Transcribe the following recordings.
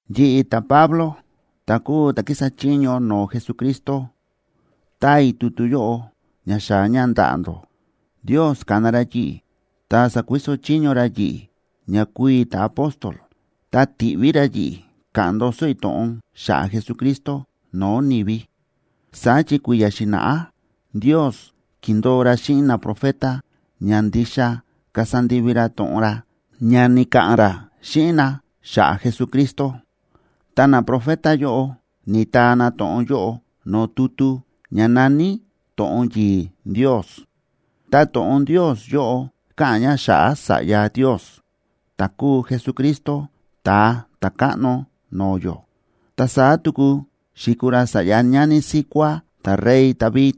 Yi̱ꞌi̱, ta̱Pablo, ta̱ kúu ta̱ kísa chiño no̱o̱ Jesucristo, táa i̱ tutu yóꞌo ña xaa̱ ña ndaꞌa̱ ndó. Ndios ka̱na ra yi̱ꞌi̱ ta sa̱kuiso chiño ra yi̱ꞌi̱ ña kuu i̱ ta̱apóstol, ta ti̱ꞌví ra yi̱ꞌi̱ ka̱ꞌa̱n ndoso i̱ to̱ꞌon xa̱ꞌa̱ Jesucristo no̱o̱ ni̱vi. Saá chi kui̱ya̱ xi̱na̱ꞌá Ndios ki̱ndo̱o ra xíꞌin naprofeta ña ndixa kasa ndivi ra to̱ꞌon ra ña ni̱ka̱ꞌa̱n ra xíꞌin na xa̱ꞌa̱ Jesucristo. Ta naprofeta yóꞌo ni̱taa na to̱ꞌon yóꞌo no̱o̱ tutu ña na̱ní To̱ꞌon yi̱i̱ Ndios. Ta To̱ꞌon Ndios yóꞌo káꞌa̱n ña xa̱ꞌa̱ Sa̱ꞌya Ndios, ta̱ kúu Jesucristo, Ta̱a Ta̱káꞌno no̱o̱ yó. Ta saá tuku xi̱kuu ra sa̱ꞌya ñani síkuá ta̱rey David,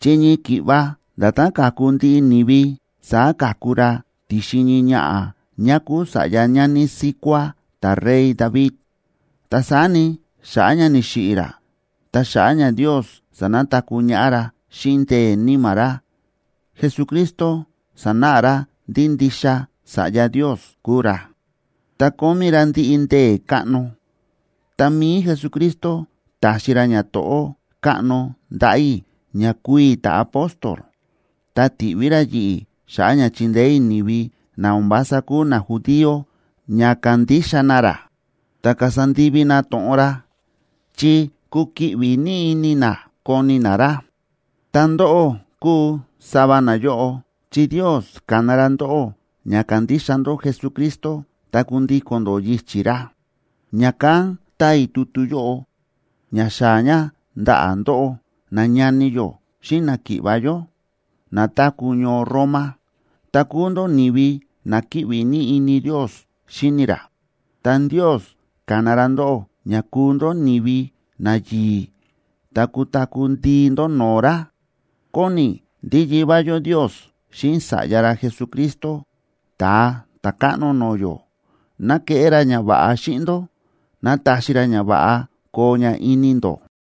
chi ñii ki̱ꞌva nda̱tán káku ndiꞌi ni̱vi, saá ka̱ku ra ti̱xin ñii ñaꞌa̱ ñá kúu sa̱ꞌya ñani síkuá ta̱rey David. Ta saá ni, xa̱ꞌa̱ ña ni̱xiꞌi̱ ra, ta xa̱ꞌa̱ ña Ndios sa̱nataku̱ ñaꞌá ra xíꞌin ndee̱ Níma̱ ra, Jesucristo sa̱náꞌa ra ndí ndixa Sa̱ꞌya Ndios kúu ra, ta kómí ra ndiꞌi ndee̱ káꞌno. Ta mi̱i Jesucristo ta̱xi ra ñato̱ꞌó káꞌno ndaꞌa̱ i̱ ña kuu i̱ ta̱apóstol, ta ti̱ꞌví ra yi̱ꞌi̱ xa̱ꞌa̱ ña chindeé i̱ ni̱vi na o̱n vása kúu najudío ña kandixa na ra, ta kasa ndivi na to̱ꞌon ra, chi kukiꞌvi ní ini na koni na ra. Ta ndóꞌó kúu sava nayóꞌo, chi Ndios ka̱na ra ndóꞌó ña kandixa ndó Jesucristo ta kundíko̱n ndó yichi̱ ra. Ña̱kán táa i̱ tutu yóꞌo ña xaa̱ ña ndaꞌa̱ ndóꞌó, nañani yó xíꞌin náki̱ꞌva̱ yó, na táku̱ ñoo Roma, ta kúu ndó ni̱vi na kíꞌvi ní ini Ndios xíni ra. Ta Ndios ka̱na ra ndóꞌó ña kuu ndó ni̱vi nayi̱i̱ ta kutaku̱ ndii ndó no̱o̱ ra. Kóni i̱ ndí Yivá yó Ndios xíꞌin Sa̱ꞌya ra Jesucristo, Ta̱a Ta̱káꞌno no̱o̱ yó, ¡ná keꞌé ra ñava̱ꞌa xíꞌin ndó! ¡Ná taxi ra ñava̱ꞌa koo ña ini ndó!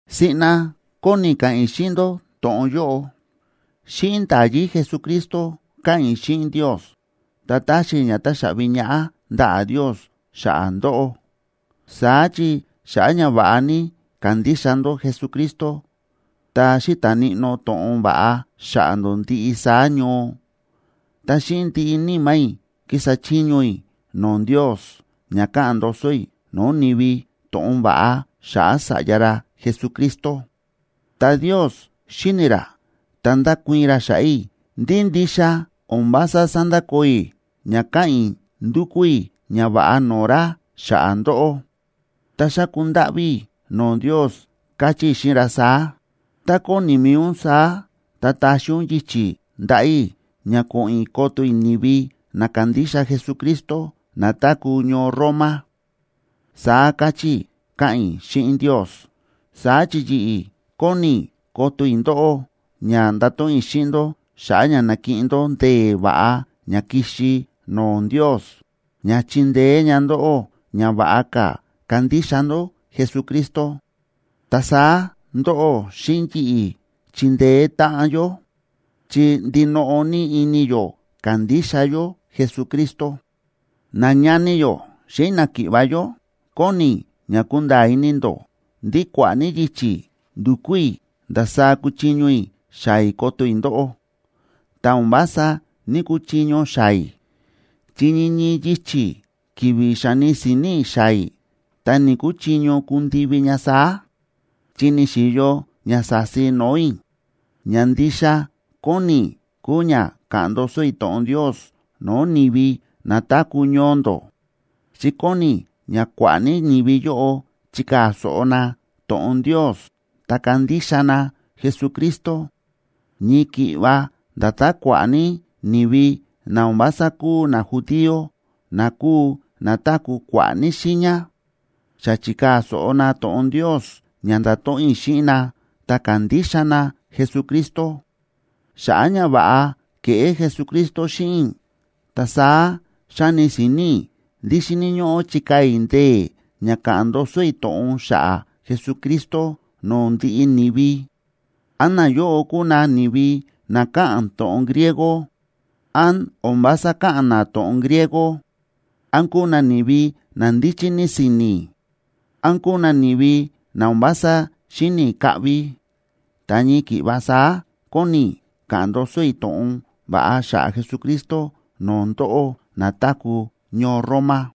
Siꞌna kóni i̱ ka̱ꞌa̱n i̱ xíꞌin ndó to̱ꞌon yóꞌo: Xíꞌin nda̱yí Jesucristo, káꞌa̱n i̱ xíꞌin Ndios, ta táxi i̱ ña táxaꞌvi ñaꞌá ndaꞌa̱ Ndios xa̱ꞌa̱ ndóꞌó. Saá chi xa̱ꞌa̱ ña va̱ꞌa ní kándixa ndó Jesucristo, ta xíta̱ níꞌnó to̱ꞌon va̱ꞌa xa̱ꞌa̱ ndó ndiꞌi saá ñoo. Ta xíꞌin ndiꞌi níma̱ i̱ kísa chiño i̱ no̱o̱ Ndios, ña káꞌa̱n ndoso i̱ no̱o̱ ni̱vi to̱ꞌon va̱ꞌa xa̱ꞌa̱ Sa̱ꞌya ra Jesucristo. Ta Ndios xíni ra ta ndákuii̱n ra xa̱ꞌa̱ i̱ ndí ndixa o̱n vása sándakoo i̱ ña káꞌa̱n i̱ ndúkú i̱ ñava̱ꞌa no̱o̱ ra xa̱ꞌa̱ ndóꞌó, ta xáku ndáꞌví i̱ no̱o̱ Ndios, káchí i̱ xíꞌin ra saá: “Tá kóni mi̱i ún saá, ta taxi ún yichi̱ ndaꞌa̱ i̱ ña ko̱ꞌo̱n i̱ koto i̱ ni̱vi na kándixa Jesucristo, na táku̱ ñoo Roma”, saá káchí i̱ káꞌa̱n i̱ xíꞌin Ndios. Saá chi yi̱ꞌi̱ kóni i̱ koto i̱ ndóꞌó ña ndato̱ꞌon i̱ xíꞌin ndó xa̱ꞌa̱ ña nakiꞌin ndó ndee̱ va̱ꞌa ña ki̱xi no̱o̱ Ndios, ña chindeé ña ndóꞌó ña va̱ꞌa ka̱ kandixa ndó Jesucristo. Ta saá, ndóꞌó xíꞌin yi̱ꞌi̱ chindeé táꞌan yó, chi ndinoꞌo ní ini yó kándixa yó Jesucristo. Nañani yó xíꞌin náki̱ꞌva̱ yó, kóni i̱ ña kunda̱a̱ ini ndó ndí kua̱ꞌa̱ ní yichi̱ ndu̱kú i̱ ndasaá kuchiño i̱ xaa̱ i̱ koto i̱ ndóꞌó, ta o̱n vása ní‑kuchiño xaa̱ i̱, chi ñii ñii yichi̱ ki̱vi̱ xáni si̱ni̱ i̱ xaa̱ i̱, ta ni̱‑kuchiño kundivi ña saá, chi ni̱xi̱yo ña sa̱si no̱o̱ i̱. Ña ndixa kóni i̱ kúu ña ka̱ꞌa̱n ndoso i̱ to̱ꞌon Ndios no̱o̱ ni̱vi na táku̱ ñoo ndó, chi kóni i̱ ña kua̱ꞌa̱ ní ni̱vi yóꞌo chikaa̱ so̱ꞌo na to̱ꞌon Ndios ta kandixa na Jesucristo, ñii ki̱ꞌva nda̱tán kua̱ꞌa̱ ní ni̱vi na o̱n vása kúu najudío na kúu na táku̱ kua̱ꞌa̱ ní xiiña, xa chi̱kaa̱ so̱ꞌo na to̱ꞌon Ndios ña nda̱to̱ꞌon i̱ xíꞌin na ta ka̱ndixa na Jesucristo. Xa̱ꞌa̱ ñava̱ꞌa ke̱ꞌé Jesucristo xíꞌin i̱, ta saá xáni si̱ni̱ i̱ ndí xíni̱ ñóꞌó chikaa̱ i̱ ndee̱ ña ka̱ꞌa̱n ndoso i̱ to̱ꞌon xa̱ꞌa̱ Jesucristo no̱o̱ ndiꞌi ni̱vi: án nayóꞌo kúu na ni̱vi na káꞌa̱n to̱ꞌon griego, án o̱n vása káꞌa̱n na to̱ꞌon griego, án kúu na ni̱vi na ndíchí ní si̱ni̱, án kúu na ni̱vi na o̱n vása xíni̱ kaꞌvi. Ta ñii ki̱ꞌva saá kóni i̱ ka̱ꞌa̱n ndoso i̱ to̱ꞌon va̱ꞌa xa̱ꞌa̱ Jesucristo no̱o̱ ndóꞌó na táku̱ ñoo Roma.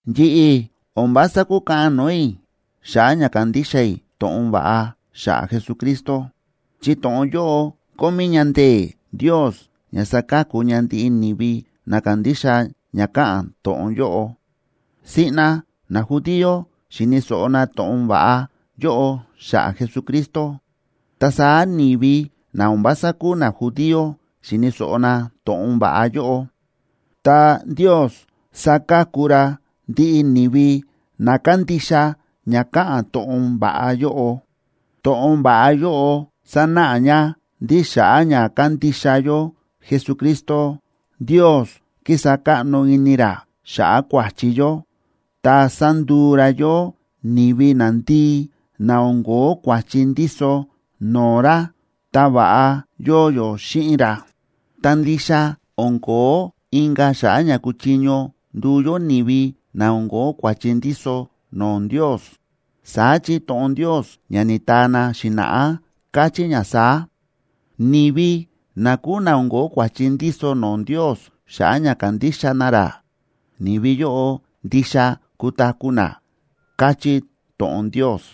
Yi̱ꞌi̱ o̱n vása kúkaꞌan no̱o̱ i̱ xa̱ꞌa̱ ña kándixa i̱ to̱ꞌon va̱ꞌa xa̱ꞌa̱ Jesucristo, chi to̱ꞌon yóꞌo kómí ña ndee̱ Ndios ña saka̱ku ña ndiꞌi ni̱vi na kándixa ña káꞌa̱n to̱ꞌon yóꞌo. Siꞌna najudío xi̱ni̱ so̱ꞌo na to̱ꞌon va̱ꞌa yóꞌo xa̱ꞌa̱ Jesucristo, ta saá ni̱vi na o̱n vása kúu najudíoa xi̱ni̱ so̱ꞌo na to̱ꞌon va̱ꞌa yóꞌo. Ta Ndios sáka̱ku ra ndiꞌi ni̱vi na kándixa ña káꞌa̱n to̱ꞌon va̱ꞌa yóꞌo. To̱ꞌon va̱ꞌa yóꞌo sánáꞌa ña ndí xa̱ꞌa̱ ña kándixa yó Jesucristo, Ndios kísa káꞌno ini ra xa̱ꞌa̱ kua̱chi yó, ta sánduu ra yó ni̱vi nandii, na o̱n ko̱ó kua̱chi ndíso no̱o̱ ra, ta va̱ꞌa yóo yó xíꞌin ra. Ta ndixa o̱n ko̱ó inka̱ xa̱ꞌa̱ ña kuchiño nduu yó ni̱vi na o̱n ko̱ó kua̱chi ndíso no̱o̱ Ndios. Saá chi to̱ꞌon Ndios ña ni̱taa na xi̱na̱ꞌá káchí ña saá: “Ni̱vi na kúu na o̱n ko̱ó kua̱chi ndíso no̱o̱ Ndios xa̱ꞌa̱ ña kándixa na ra, ni̱vi yóꞌo, ndixa kutaku̱ na”, káchí to̱ꞌon Ndios.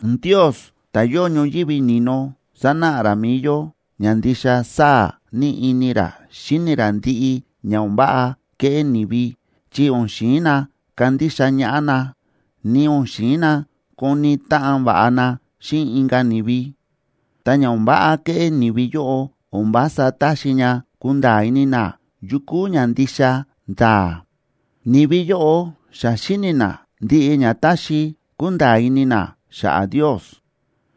Ndios ta̱ yóo ñoyívi ni̱no, sánáꞌa ra mi̱i yó ña ndixa sáa̱ ní ini ra xíni ra ndiꞌi ña o̱n váꞌa kéꞌé ni̱vi chi o̱n xi̱in na kandixa ñaꞌá na, ni o̱n xi̱in na koni táꞌan va̱ꞌa na xíꞌin inka̱ ni̱vi. Ta ña o̱n váꞌa kéꞌé ni̱vi yóꞌo o̱n vása táxi ña kunda̱a̱ ini na yu kúu ña ndixa nda̱a̱. Ni̱vi yóꞌo xa xíni̱ na ndiꞌi ña táxi kunda̱a̱ ini na xa̱ꞌa̱ Ndios,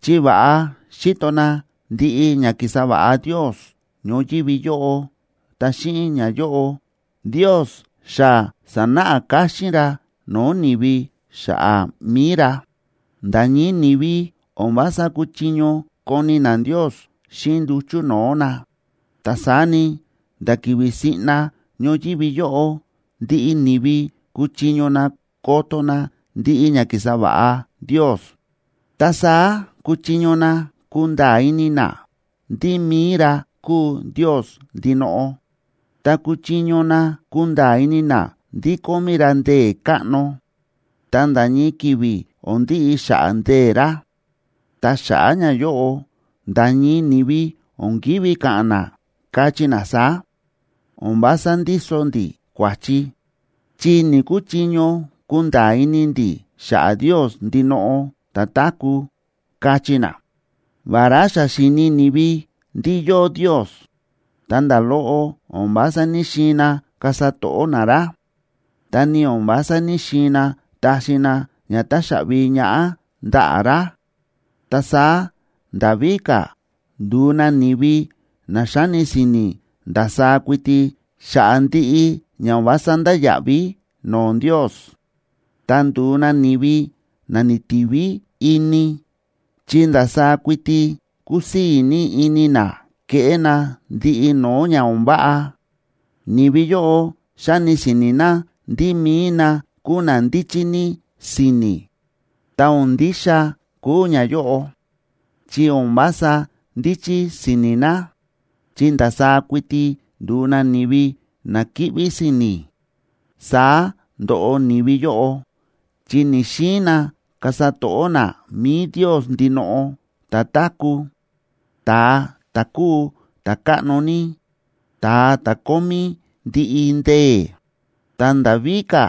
chi va̱ꞌa xíto na ndiꞌi ña ki̱sa va̱ꞌa Ndios ñoyívi yóꞌo. Ta xíꞌin ñayóꞌo, Ndios xa sa̱náꞌa káxín ra no̱o̱ ni̱vi xa̱ꞌa̱ mi̱i ra. Nda̱ ñii ni̱vi o̱n vása kúchiño koni na Ndios xíꞌin nduchu̱ no̱o̱ na, ta saá ni, nda̱ ki̱vi̱ siꞌna ñoyívi yóꞌo ndiꞌi ni̱vi kúchiño na koto na ndiꞌi ña ki̱sa va̱ꞌa Ndios. Ta saá kúchiño na kunda̱a̱ ini na ndí mi̱i ra kúu Ndios ndinoꞌo, ta kúchiño na kunda̱a̱ ini na ndí kómí ra ndee̱ káꞌno, ta nda̱ ñii ki̱vi̱ o̱n ndiꞌi xa̱ꞌa̱ ndee̱ ra. Ta xa̱ꞌa̱ ñayóꞌo, nda̱ ñii ni̱vi o̱n ki̱ví ka̱ꞌa̱n na, kachí na saá: “O̱n vása ndíso ndi̱ kua̱chi, chi ni̱‑kuchiño kunda̱a̱ ini ndi̱ xa̱ꞌa̱ Ndios ndinoꞌo ta̱táku̱”, kachí na. Vará xa xíni̱ ni̱vi ndí yóo Ndios, ta nda̱ loꞌo o̱n vása ní‑xiin na kasa to̱ꞌó na ra, ta ni o̱n vása ní‑xiin na taxi na ña táxaꞌvi ñaꞌá ndaꞌa̱ ra. Ta saá nda̱ víka̱ ndu̱u na ni̱vi na xáni si̱ni̱ ndasaá kuiti xa̱ꞌa̱ ndiꞌi ña o̱n vása ndáya̱ꞌví no̱o̱ Ndios. Ta ndu̱u na ni̱vi na ni̱tiví ini, chi ndasaá kuiti kúsii̱ ní ini na kéꞌé na ndiꞌi no̱o̱ ña o̱n váꞌa. Ni̱vi yóꞌo xáni si̱ni̱ na ndí mi̱i na kúu na ndíchí ní si̱ni̱, ta o̱n ndixa kúu ñayóꞌo, chi o̱n vása ndíchí si̱ni̱ na, chi ndasaá kuiti ndu̱u na ni̱vi na kíꞌví si̱ni̱. Saá ndo̱ꞌo ni̱vi yóꞌo, chi ni̱‑xiin na kasa to̱ꞌó na mi̱i Ndios ndinoꞌo, ta̱táku̱, ta̱a ta̱ kúu ta̱káꞌno ní, ta̱a ta̱ kómí ndiꞌi ndee̱. Ta nda̱ víka̱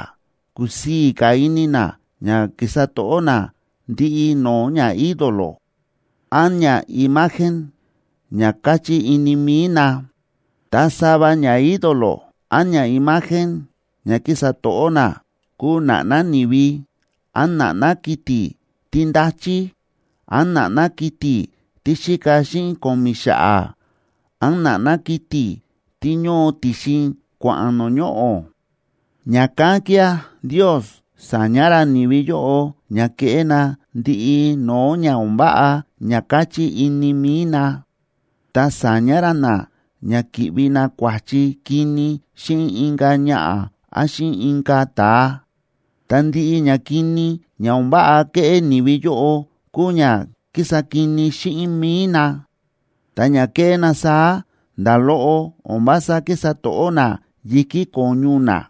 kúsii̱ ka̱ ini na ña kísa to̱ꞌó na ndiꞌi no̱o̱ ñaídolo, án ñaimagen ña káchí ini mi̱i na. Ta sava ñaídolo án ñaimagen ña kísa to̱ꞌó na kúu na̱ꞌná ni̱vi, án na̱ꞌná kiti̱ tí ndáchí, án na̱ꞌná kiti̱ tí xíka xíꞌin ko̱mi̱ xa̱ꞌa̱, án na̱ꞌná kiti̱ tí ñóo ti̱xin kua̱ꞌa̱n no̱o̱ ñoꞌo̱. Ña̱kán kía̱ Ndios sa̱ña ra ni̱vi yóꞌo ña keꞌé na ndiꞌi no̱o̱ ña o̱n váꞌa ña káchí ini mi̱i na, ta sa̱ña ra na ña ki̱ꞌvi na kua̱chi kini xíꞌin inka̱ ñaꞌa̱ án xíꞌin inka̱ ta̱a. Ta ndiꞌi ñakini ña o̱n váꞌa ke̱ꞌé ni̱vi yóꞌo kúu ña ki̱sa kini xíꞌin mi̱i na, ta ña ke̱ꞌé na saá nda̱ loꞌo o̱n vása kísa to̱ꞌó na yi̱kí ko̱ñu na.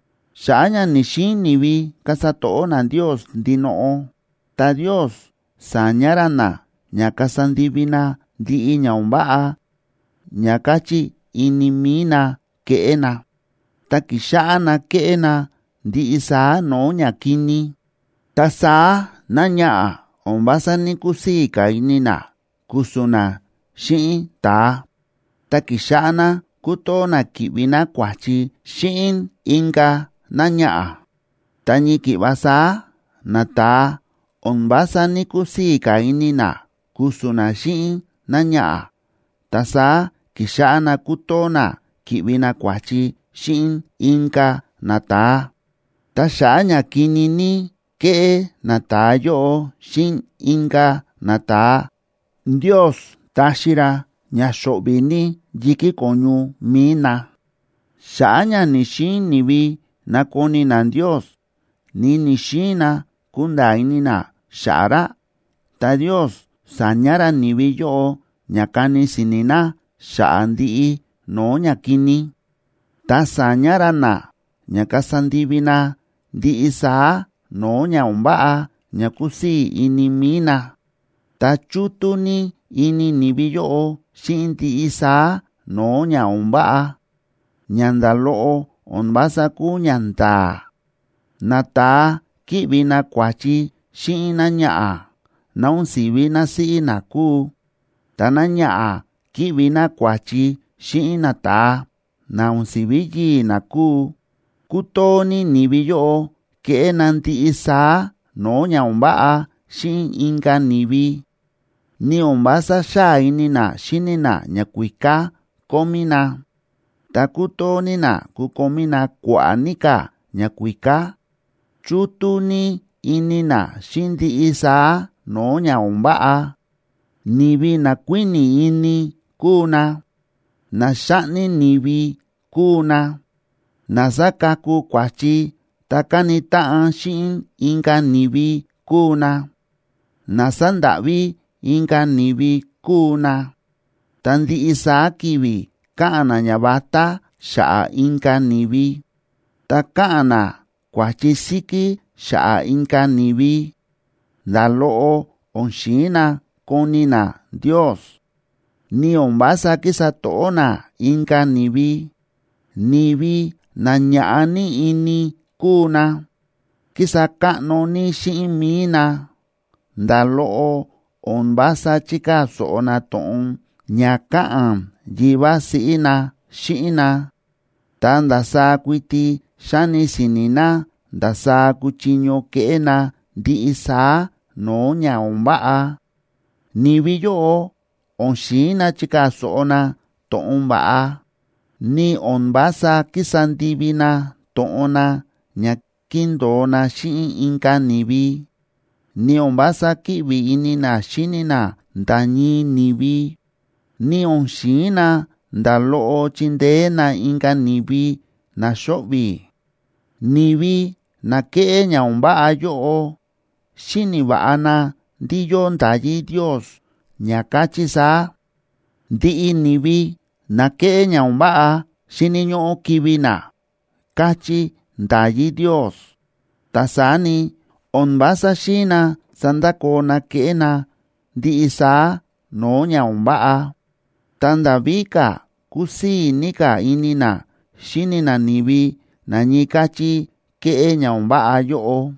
Xa̱ꞌa̱ ña ni̱‑xiin ni̱vi kasa to̱ꞌó na Ndios ndinoꞌo, ta Ndios sa̱ña ra na ña kasa ndivi na ndiꞌi ña o̱n váꞌa ña káchí ini mi̱i na keꞌé na. Ta ki̱xáꞌá na kéꞌé na ndiꞌi saá no̱o̱ ñakini. Ta saá náñaꞌa̱ o̱n vása ní‑kusii̱ ka̱ ini ná ku̱su̱n ná xíꞌin ta̱a, ta ki̱xáꞌá ná kútoo ná kíꞌvi ná kua̱chi xíꞌin inka̱ náñaꞌa̱. Ta ñii ki̱ꞌva saá, nata̱a o̱n vása ní‑kusii̱ ka̱ ini na ku̱su̱n na xíꞌin náñaꞌa̱, ta saá ki̱xáꞌá na kútoo na kíꞌvi na kua̱chi xíꞌin inka̱ nata̱a. Ta xa̱ꞌa̱ ña kini ní kéꞌé nata̱a yóꞌo xíꞌin inka̱ nata̱a, Ndios táxi ra ña xo̱ꞌvi̱ ní yi̱kí ko̱ñu mi̱i na. Xa̱ꞌa̱ ña ni̱‑xiin ni̱vi nakoni na Ndios, ni ni̱‑xiin na kunda̱a̱ ini na xa̱ꞌa̱ ra, ta Ndios sa̱ña ra ni̱vi yóꞌo ña kani si̱ni̱ na xa̱ꞌa̱ ndiꞌi no̱o̱ ñakini, ta sa̱ña ra na ña kasa ndivi na ndiꞌi saá no̱o̱ ña o̱n váꞌa ña kusii̱ ini mi̱i na. Ta chútú ní ini ni̱vi yóꞌo xíꞌin ndiꞌi saá no̱o̱ ña o̱n váꞌa, ña nda̱ loꞌo o̱n vása kúu ñanda̱a̱. Nata̱a kíꞌvi na kua̱chi xíꞌin náñaꞌa̱, ná o̱n si̱ví násíꞌí na kúu, ta náñaꞌa̱ kíꞌvi ná kua̱chi xíꞌin nata̱a, na o̱n si̱ví yii̱ ná kúu. Kútoo ní ni̱vi yóꞌo kéꞌé na ndiꞌi saá no̱o̱ ña o̱n váꞌa xíꞌin inka̱ ni̱vi. Ni o̱n vása xáa ini na xíni na ñakuíká kómí na, ta kútoo ní na kukomí na kua̱ꞌa̱ ní ka̱ ñakuíká. Chútú ní ini na xíꞌin ndiꞌi saá no̱o̱ ña o̱n váꞌa. Ni̱vi na kuíni̱ ini kúu na, na xáꞌni ni̱vi kúu na, na sákaku kua̱chi ta káni táꞌan xíꞌin inka̱ ni̱vi kúu na, na sándáꞌví inka̱ ni̱vi kúu na. Ta ndiꞌi saá ki̱vi̱ káꞌa̱n na ñavatá xa̱ꞌa̱ inka̱ ni̱vi. Ta káꞌa̱n na kua̱chi síkí xa̱ꞌa̱ inka̱ ni̱vi. Nda̱ loꞌo o̱n xi̱in na koni na Ndios, ni o̱n vása kísa to̱ꞌó na inka̱ ni̱vi. Ni̱vi na ñaꞌa̱ ní ini kúu na, kísa káꞌno ní xíꞌin mi̱i na, nda̱ loꞌo o̱n vása chíkaa̱ so̱ꞌo na to̱ꞌon ña káꞌa̱n yivá siꞌí na xíꞌin na, ta ndasaá kuiti xáni si̱ni̱ na ndasaá kuchiño keꞌé na ndiꞌi saá no̱o̱ ña o̱n váꞌa. Ni̱vi yóꞌo o̱n xi̱in na chikaa̱ so̱ꞌo na to̱ꞌon va̱ꞌa, ni o̱n vása kísa ndivi na to̱ꞌon na ña ki̱ndo̱o na xíꞌin inka̱ ni̱vi, ni o̱n vása kíꞌvi ini na xíni na nda̱ ñii ni̱vi, ni o̱n xi̱in na nda̱ loꞌo chindeé na inka̱ ni̱vi na xóꞌvi̱. Ni̱vi na kéꞌé ña o̱n váꞌa yóꞌo, xíni̱ va̱ꞌa na ndí yóo nda̱yí Ndios ña káchí saá: “Ndiꞌi ni̱vi na kéꞌé ña o̱n váꞌa xíni̱ ñóꞌó kivi̱ na”, káchí nda̱yí Ndios. Ta saá ni, o̱n vása xi̱in na sandakoo na kéꞌé na ndiꞌi saá no̱o̱ ña o̱n váꞌa, ta nda̱ víka̱ kúsii̱ ní ka̱ ini na xíni na ni̱vi na ñii káchí kéꞌé ña o̱n váꞌa yóꞌo.